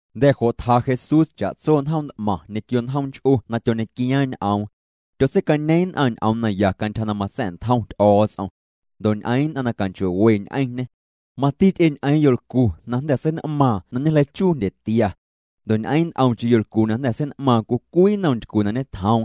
Jnda̱ jo' tja Jesús cha'tso njoom nt'maⁿ ñequio njoom nch'u na tyoñequiaaⁿ ñ'oom. Tyotseicañeeⁿ nn'aⁿ ñ'oom naya cantyja na matsa̱'ntjom Ty'o̱o̱ts'om. Ndo' ñ'eeⁿ nn'aⁿ na canchoo'we ñ'eⁿñê. Mati ty'e ñ'eeⁿ yolcu na jnda̱ sein'maaⁿ na ñejleichuu jndyetia. Ndo' ñ'eeⁿ nt'omcheⁿ yolcu na jnda̱ sein'maaⁿ cwii cwii nnom ntycu na ñetjoom.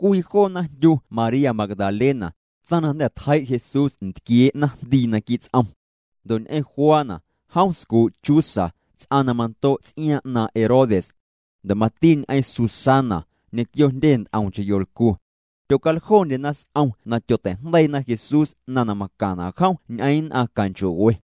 Cwii joona jndyu María Magdalena, tsaⁿ na jnda̱ tjei' Jesús ntquiee' naⁿjndii naquii' ts'om. Ndo' ñ'eⁿ Juana, jom scuu' Chuza, ts'aⁿ na mando' ts'iaaⁿ 'naaⁿ' Herodes. Ndo' mati ñ'eⁿ Susana, ñequio jndyendye nt'omcheⁿ yolcu. Tyocaljondyena s'om na tyotei'jndeiina Jesús 'naⁿ na macaⁿna' jom ñ'eⁿ nn'aⁿ canchoo'we.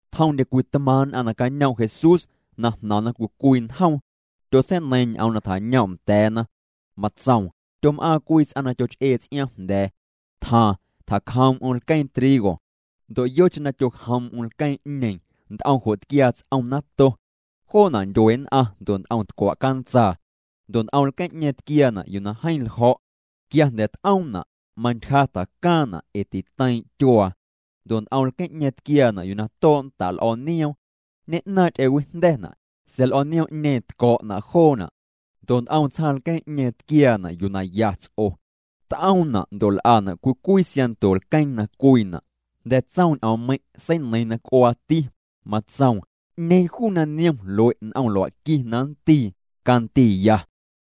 Tjomndye cwii tmaaⁿ' t'maⁿ nn'aⁿ nacañoom' Jesús, na jnaⁿna cwii cwii njoom. Tyotseineiiⁿ ñ'oom na tjañoom' nda̱a̱na. Matsoom: —Tyom'aaⁿ cwii ts'aⁿ na tyoch'ee ts'iaaⁿ jnda̱a̱. Tjaaⁿ, tjacjoom'm lqueeⁿ trigo. Ndo' yocheⁿ na tyojoom'm lqueeⁿ'ñeeⁿ, nt'om jo' tquiaa ts'om nato. Joona' ndyue nn'aⁿ ndo' nt'om tcwa' cantsaa. Ndo' nt'om lqueeⁿ'ñeeⁿ tquiaana' yuu na jeeⁿ ljo̱'. Quia jnda̱ t'oomna', mantyja tjacaaⁿna' ee titeiiⁿ' tyuaa. Ndo' nt'om lqueeⁿ'ñeeⁿ tquiaana' yuu na too' nda' l'o̱o̱ nioom. Ñe'naaⁿ' ty'ewijnda̱na', sa̱a̱ l'o̱o̱ nioom'ñeeⁿ tco̱'na' joona'. Ndo' nt'om tsjaaⁿ lqueeⁿ'ñeeⁿ tquiaana' yuu na ya ts'o. T'oomna' ndo' l'ana' cwii cwii siaⁿnto lqueeⁿ na cwiina'. Jnda̱ na tsoom ñ'oommeiⁿ', seineiiⁿ na c'uaati, matsoom: —'Ñeeⁿ juu na niom lue' n'om lua'qui na nndii, candiiya.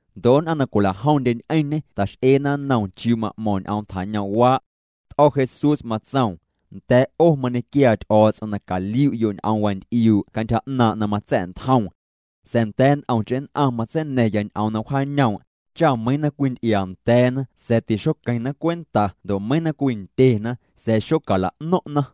Ndo' nn'aⁿ na cwila'jomndye ñ'eⁿñê ta'x'eena nnoom chiuu ma'mo̱ⁿ ñ'oom tjañoom'waa'. T'o̱ Jesús matsoom: —Nda̱a̱' 'o mañequiaa Ty'o̱o̱ts'om na caliu'yo' ñ'oom wanty'iuu' cantyja 'naaⁿ' na matsa̱'ntjoom. Sa̱a̱ nda̱a̱ nt'omcheⁿ nn'aⁿ matseina̱ⁿya ñ'oom na wjaañoom', cha meiiⁿ na cwinty'iaa nda̱a̱na sa̱a̱ tixoqueⁿna cwenta ndo' meiiⁿ na cwindyena sa̱a̱ xocala'no̱ⁿ'na.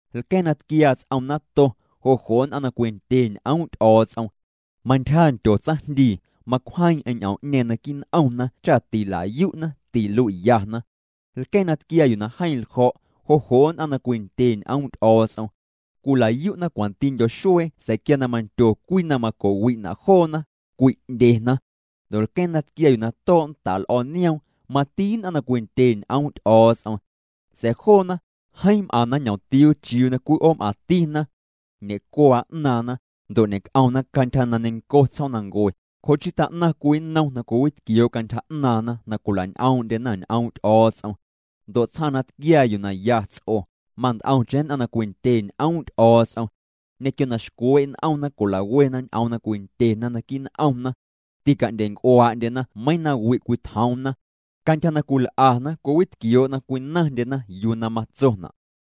Lqueeⁿ na tquiaa ts'om nato, jo' jo' nn'aⁿ na cwindye ñ'oom' Ty'o̱o̱ts'om. Mantyja ndyo tsaⁿjndii, macwjeeⁿ'eⁿ ñ'oom'ñeeⁿ naquii' n'omna cha tila'yu'na, tilui'yana. Lqueeⁿ na tquiaa yuu na jeeⁿ ljo̱', jo' jo' nn'aⁿ na cwindye ñ'oom' Ty'o̱o̱ts'om. Cwila'yu'na cwantindyo xuee sa̱a̱ quia na mandyo cwii na maco'wi'na' joona, cwi'ndyena. Ndo' lqueeⁿ na tquiaa yuu na too' nda' l'o̱o̱ nioom, mati nn'aⁿ na cwindye ñ'oom' Ty'o̱o̱ts'om. Sa̱a̱ joona, jeeⁿ m'aⁿna ñ'omtiuu chiuu na cwii 'oom'aⁿtina. Ñe'cuaa 'naaⁿna, ndo' ñe'c'omna cantyja na neiⁿnco tsjoomnancue. Jo' chii tjaa'naⁿ cwii nnom na cwiwitquioo' cantyja 'naaⁿna na cwila'ñ'oom'ndyena ñ'oom' Ty'o̱o̱ts'om. Ndo' tsjaaⁿ na tquiaa yuu na ya ts'o, mant'omcheⁿ nn'aⁿ na cwindye ñ'oom' Ty'o̱o̱ts'om. Ñequio na xcwee' n'omna cwila'wena ñ'oom na cwindyena naquii' n'omna. Tica'ndyenc'uaa'ndyena meiiⁿ nawi' cwitjoomna. Cantyja na cwil'ana cwiwitquioo' na cwinaⁿndyena yuu na matsona'.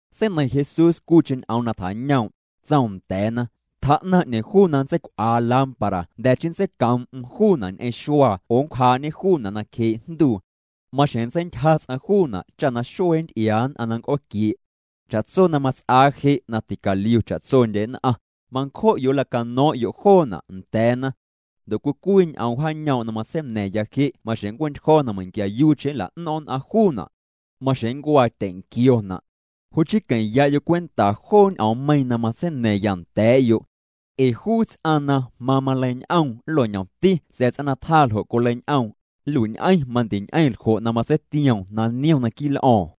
Seineiⁿ Jesús cwiicheⁿ ñ'oom na tjañoom'. Tsoom nda̱a̱na: —Tjaa'naⁿ 'ñeeⁿ juu na nntseicw'aa lámpara jnda̱ chii nntseicoom'm juuna' ñ'eⁿ xuaa oo nncwjaa'ñê juuna' nacjee' jnduu. Maxjeⁿ nntseintyja ts'aⁿ juuna' cha na xuee nnty'iaa nn'aⁿ na nnc'ooquie'. Cha'tso na mats'aa je' na ticaliu cha'tsondye nn'aⁿ, mancjo'yo' nlacano̱o̱ⁿ'yo' joona' nda̱a̱na. Ndo' cwii cwii ñ'oom wjaañoom' na matseina̱ⁿya je' maxjeⁿ nncue'ntyjo̱ na meiⁿquiayuucheⁿ nla'no̱ⁿ' nn'aⁿ juuna'. Maxjeⁿ nncuaa tyenquiona'. ’Jo' chii queⁿ'ya'yo' cwenta joo ñ'oommeiiⁿ na matseina̱ⁿya nda̱a̱'yo'. Ee juu ts'aⁿ na mamaleiñ'oom nlo'ñomti sa̱a̱ ts'aⁿ na tjaa ljo' coleiñ'oom, nlui'ñ'eⁿ mandiñ'eⁿ ljo' na matseitioom na niom naquii' l'o̱o̱ⁿ.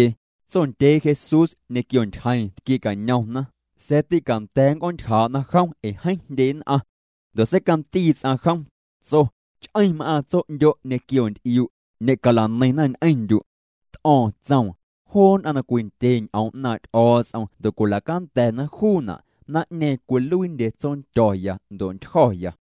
Tsondyee Jesús ñequio ntyjeeⁿ tquie'cañomna, sa̱a̱ tîcanda̱a̱ nnc'oontyjaa'na jom ee jeeⁿ jndye nn'aⁿ. Ndo' seicandii ts'aⁿ jom, tso: —Ch'eⁿ m'aaⁿ tso'ndyo' ñequio nty'iu'. Ñe'cala'neiⁿna ñ'eⁿndyu'. T'o̱o̱ⁿ tsoom: —Joo nn'aⁿ na cwindye ñ'oom 'naaⁿ' Ty'o̱o̱ts'om ndo' cwila'canda̱ juuna', naⁿ'ñeeⁿ cwiluiindye tsondyo̱ya ndo' ntyjo̱ya.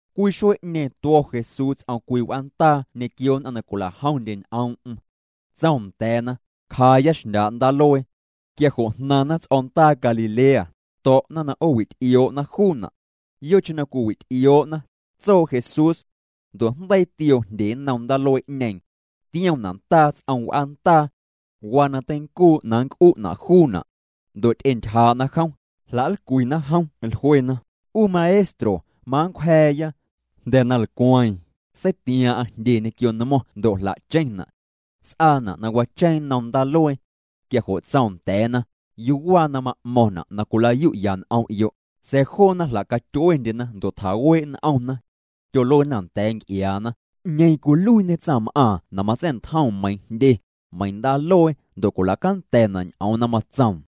Cwii xuee'ñeeⁿ tuo̱ Jesús ts'om cwii w'aandaa ñequio nn'aⁿ na cwila'jomndye ñ'oom'm. Tsoom nda̱a̱na: —Cjaaya xndyaa' ndaaluee. Quia jo' jnaⁿna ts'o̱ndaa Galilea, to̱'na na 'oowity'ioo'na juuna'. Yocheⁿ na cwiwi'ty'ioo'na, tsoo Jesús. Ndo' jndeii tioo jndye nnom ndaaluee'ñeeⁿ. Tiomna' ndaa ts'om w'aandaa. Waa na teincuu' na nnc'u'na' juuna'. Ndo' ty'entyjaa'na jom, jla'nlcwina jom, jluena: —'U Maestro, manncwja̱a̱ya. Jnda̱ na lcweeⁿ, seitiaaⁿ'aⁿ jndye ñequio nmo̱ⁿ ndo' jla'cheⁿna'. S'aana' na wacheeⁿ nnom ndaaluee. Quia jo' tsoom nda̱a̱na: —¿Yuu waa na ma'mo̱ⁿna' na cwilayu'ya n'om'yo'? Sa̱a̱ joona jla'catyuendyena ndo' tjaawee' n'omna. Tyoluena nda̱a̱ nc'iaana: —¿'Ñeeⁿ cwiluiiñe tsaⁿm'aaⁿ na matsa̱'ntjoom meiiⁿ jndye, meiiⁿ ndaaluee ndo' cwila'canda̱na' ñ'oom na matsoom?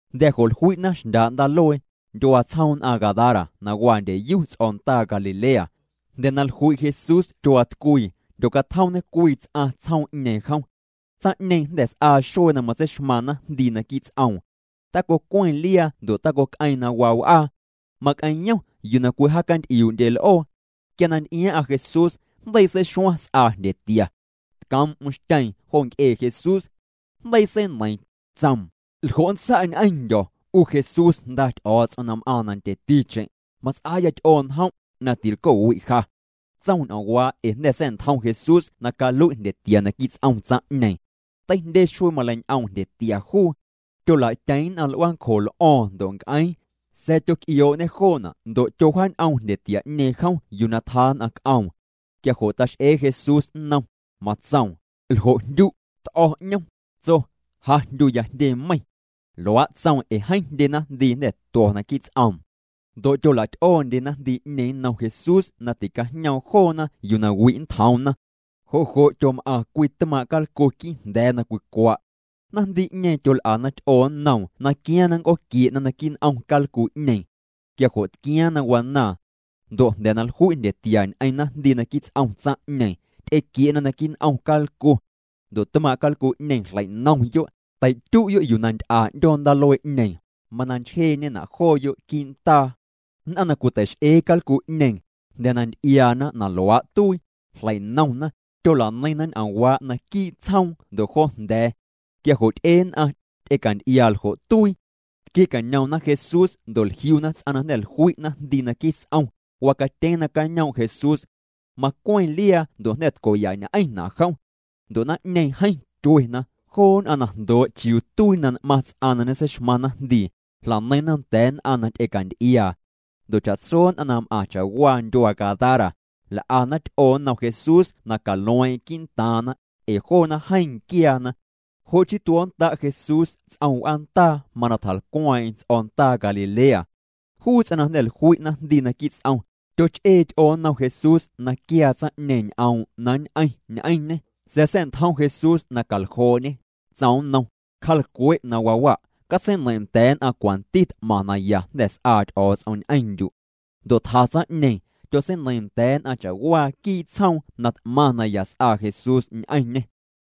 Jnda̱ jo' jlui'na xndyaa' ndaaluee, ndyuaa tsjoom nn'aⁿ Gadara na waa ndyeyu ts'o̱ndaa Galilea. Jnda̱ na jlui' Jesús tyuaatcwii, jndyocatjomñe cwii ts'aⁿ tsjoom'ñeeⁿ jom. Tsaⁿ'ñeeⁿ jnda̱ s'aa xuee na matseixmaaⁿ naⁿjndii naquii' ts'oom. Tacocweⁿ liaa ndo' tacoc'eeⁿ na waa w'aa. Mac'eⁿyom yuu na cwijaacanty'iuu'ndye l'oo. Quia na nty'iaaⁿ'aⁿ Jesús, jndeii seixuaⁿ s'aa jndyetia. Tcoom'm xtyeeⁿ jo nc'ee Jesús. Jndeii seineiiⁿ, tsoom: —¿Ljo' nntsa' ñ'eⁿndyo̱, 'u Jesús, Jnda Ty'o̱o̱ts'om na m'aaⁿ nandyeticheⁿ? Mats'aaya ty'oo njom', na tilco'wi' ja. Tsoom ñ'oomwaa' ee jnda̱ sa̱'ntjom Jesús na calui' jndyetia naquii' ts'om tsaⁿ'ñeeⁿ. Teijndye xuee maleiñ'oom jndyetia juu. Tyolatyeⁿ nn'aⁿ l'uaancjo l'o̱o̱ⁿ ndo' nc'eeⁿ. Sa̱a̱ tyoc'ioo'ñê joona' ndo' tyowjaañ'oom jndyetia'ñeeⁿ jom yuu na tjaa nn'aⁿ c'oom. Quia jo' tax'ee Jesús nnom, matsoom: —¿Ljo' jndyu'? T'o̱ 'ñom, tso: —Ja jndyuya Jndye Meiⁿ. Luaa' tsoom ee jeeⁿ jndye naⁿjndii jnda̱ tuo̱ naquii' ts'oom. Ndo' tyola'ty'oondye naⁿjndii'ñeeⁿ nnom Jesús na ticajñoom joona yuu na wi' nntjoomna. Jo' jo' tyom'aⁿ cwii tmaaⁿ' calcu quii' jnda̱a̱ na cwicwa'. Naⁿjndii'ñeeⁿ tyol'ana ty'oo nnoom na quiaaⁿ na nnc'ooquie'na naquii' n'om calcu'ñeeⁿ. Quia jo' tquiaaⁿ na wanaaⁿ. Ndo' jnda̱ na jlui' jndyetia ñ'eⁿ naⁿjndii naquii' ts'om tsaⁿ'ñeeⁿ, ty'equie'na naquii' n'om calcu. Ndo' tmaaⁿ' calcu'ñeeⁿ jlei'nomyo', tei'tyu'yo' yuu na nty'a 'ndyoo ndaaluee'ñeeⁿ, mana nchjeeñena' jooyo' quii' ndaa. Nn'aⁿ na cwitei'x'ee calcu'ñeeⁿ, jnda̱ na nty'iaana na luaa' tuii, jlei'nomna, tyola'neiⁿna ñ'oomwaa' naquii' tsjoom ndo' jo jnda̱a̱. Quia jo' ty'e nn'aⁿ, ty'ecanty'iaa ljo' tuii. Tquie'cañomna Jesús ndo' jliuna ts'aⁿ na jnda̱ jlui' naⁿjndii naquii' ts'om, wacatyeeⁿ nacañoom' Jesús. Macweⁿ liaa ndo' jnda̱ tco'yañ'eⁿna' jom. Ndo' naⁿ'ñeeⁿ, jeeⁿ tyuena. Joo nn'aⁿ na jndoo' chiuu tuii na n'maⁿ ts'aⁿ na ñeseixmaⁿ naⁿjndii, jla'neiⁿna nda̱a̱ nn'aⁿ na ty'ecanty'iaa. Ndo' cha'tso nn'aⁿ na m'aⁿ cha'waa ndyuaa Gadara, l'ana ty'oo nnom Jesús na calueeⁿ'eⁿ quii'ntaaⁿna, ee joona jeeⁿ nquiaana. Jo' chii tuo̱nnda' Jesús ts'om w'aandaa mana tjalcweeⁿ'eⁿ ts'o̱ndaa Galilea. Juu ts'aⁿ na jnda̱ jlui' naⁿjndii naquii' ts'om, tyoch'ee ty'oo nnom Jesús na quiaa tsaⁿ'ñeeⁿ ñ'oom' na nñ'eⁿ ñ'eⁿñê, sa̱a̱ sa̱'ntjom Jesús na caljoo'ñê. Tsoom nnom: —Cja'lcwe' na waa wa', catseineiⁿ' nda̱a̱ nn'aⁿ cwanti t'maⁿ naya jnda̱ s'aa Ty'o̱o̱ts'om ñ'eⁿndyu'. Ndo' tja tsaⁿ'ñeeⁿ, tyotseineiiⁿ nda̱a̱ nn'aⁿ cha'waa quii' tsjoom na t'maⁿ naya s'aa Jesús ñ'eⁿñê.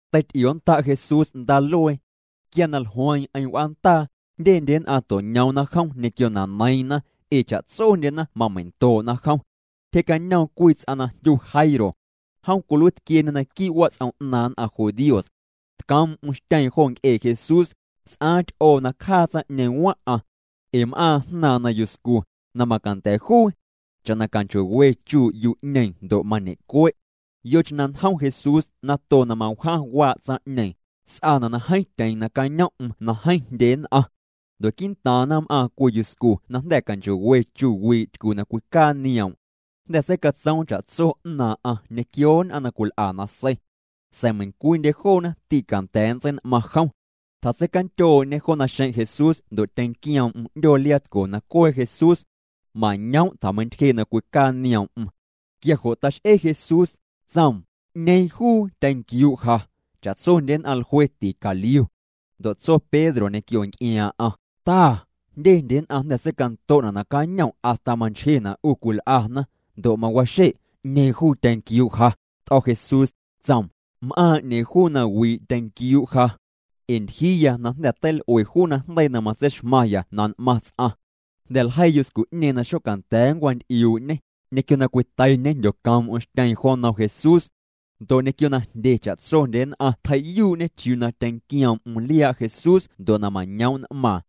Teity'ionnda' Jesús ndaaluee. Quia na jlueeⁿ'eⁿ w'aandaa, jndyendye nn'aⁿ to'ñoomna jom ñequio na neiiⁿna, ee cha'tsondyena mamei'ndoo'na jom. Tyjee'cañoom cwii ts'aⁿ na jndyu Jairo. Jom cwiluiitquieñê naquii' wats'om 'naaⁿ nn'aⁿ judíos. Tcoom'm xtyeeⁿ jo nc'ee Jesús, s'aaⁿ ty'oo na cjaa tsaⁿ'ñeeⁿ waⁿ'aⁿ. Ee m'aaⁿ jnaaⁿ na yuscu, na macanda̱ juu. Cha'na canchoo'we chuu' yu'ñeeⁿ ndo' mañe'cue'. Yocheⁿ na njom Jesús nato na mawjaⁿ waa' tsaⁿ'ñeeⁿ, s'aana' na jeeⁿ tyeeⁿ nacañom'm na jeeⁿ jndye nn'aⁿ. Ndo' quii'ntaaⁿna m'aaⁿ cwii yuscu na jnda̱ canchoo'we chu wii' tycu na cwicaa nioom'. Jnda̱ seicatsoom cha'tso 'naaⁿ'aⁿ ñequio nn'aⁿ na cwil'a nasei. Sa̱a̱ meiⁿcwiindye joona tîcanda̱a̱ nntsein'maⁿ jom. Tjatseicandyoo'ñê jo naxeⁿ' Jesús ndo' tyenquioom'm 'ndyoo liaatco na cwee Jesús. Mañoom' tjameintyjee' na cwicaa nioom'm. Quia jo' tax'e Jesús, tsoom: —¿'Ñeeⁿ juu tyenquiuu' ja? Cha'tsondye nn'aⁿ jlue ticaliu. Ndo' tso Pedro ñequio nc'iaaⁿ'aⁿ: —Ta, jndyendye nn'aⁿ jnda̱ seicanto'na' nacañom' hasta manchjena' 'u cwil'ana, ndo' mawaxe': “¿'Ñeeⁿ juu tyenquiuu' ja?” T'o̱ Jesús, tsoom: —M'aaⁿ 'ñeeⁿ juu na wii' tyenquiuu' ja. Ee ntyjiiya na jnda̱ teil'ue juu najndeii na matseixmaⁿya na n'maⁿ ts'aⁿ. Jnda̱ na ljeii yuscu'ñeeⁿ na xocanda̱a̱ nncwanty'iuu'ñê, ñequio na cwiteiñê jndyocoom'm xtyeeⁿ jo nnom Jesús. Ndo' ñequio na ndye cha'tsondye nn'aⁿ tjei'yuu'ñê chiuu na tyenquioom'm liaa' Jesús ndo' na mañoom' n'maaⁿ.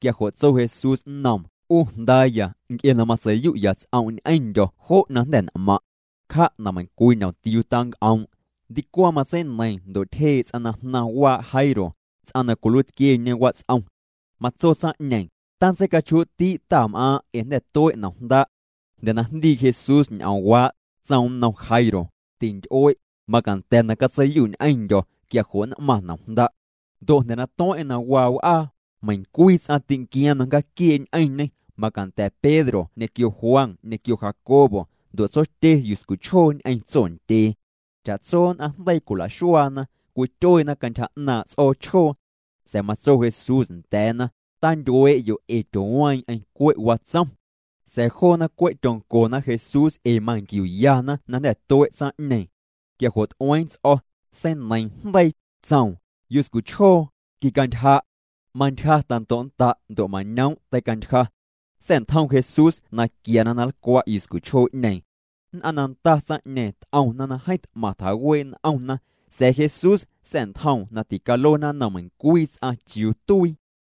Quia jo' tso Jesús nnoom: —'U jndaaya, nc'e na matsei'yu'ya' ts'om' ñ'eⁿndyo̱ jo' na jnda̱ n'maⁿ'. Cja' na meiⁿncwii ñomtiuu tanc'oom'. Ndicwaⁿ matseineiiⁿ ndo' tyjee' ts'aⁿ na jnaⁿ waa' Jairo, ts'aⁿ na cwiluiitquieñe wats'om. Matso tsaⁿ'ñeeⁿ: —Tantseicachjuu'ti' Tam'aaⁿ' ee jnda̱ tue' nomjnda'. Jnda̱ na jndii Jesús ñ'oomwaa', tsoom nnom Jairo: —Tinty'ue', macanda̱ na catseiyu' ñ'eⁿndyo̱, quia jo' nn'maⁿ nomjnda'. Ndo' jnda̱ na tueⁿ'eⁿ na waa w'aa, meiⁿcwii ts'aⁿ tînquiaaⁿ na nncjaaquiee' ñ'eⁿñê, macanda̱ Pedro ñequio Juan ñequio Jacobo, ndo' tsotye yuscuchjoo ñ'eⁿ tsondyee. Cha'tso nn'aⁿ jndeii cwila'xuaana, cwityueena cantyja 'naaⁿ' ts'oochjoo. Sa̱a̱ matso Jesús nda̱a̱na: —Tantyuee'yo' ee tyooweeⁿ'eⁿ, cwe' watsom. Sa̱a̱ joona, cwe' tyoncona Jesús ee manquiuyana na jnda̱ tue' tsaⁿ'ñeeⁿ. Quia jo' t'ueeⁿ ts'o̱, seineiiⁿ jndeii, tsoom: —Yuscuchjoo, quicantyja'. Mantyja tando'nnda' ndo' mañoom' teicantyja. Sa̱'ntjom Jesús na quiana na nlcwa' yuscuchjoo'ñeeⁿ. Nn'aⁿ na nda tsaⁿ'ñeeⁿ t'omna na jeeⁿ t'maⁿ tjawee' n'omna, sa̱a̱ Jesús sa̱'ntjoom na ticaluena nnom meiⁿcwii ts'aⁿ chiuu tuii.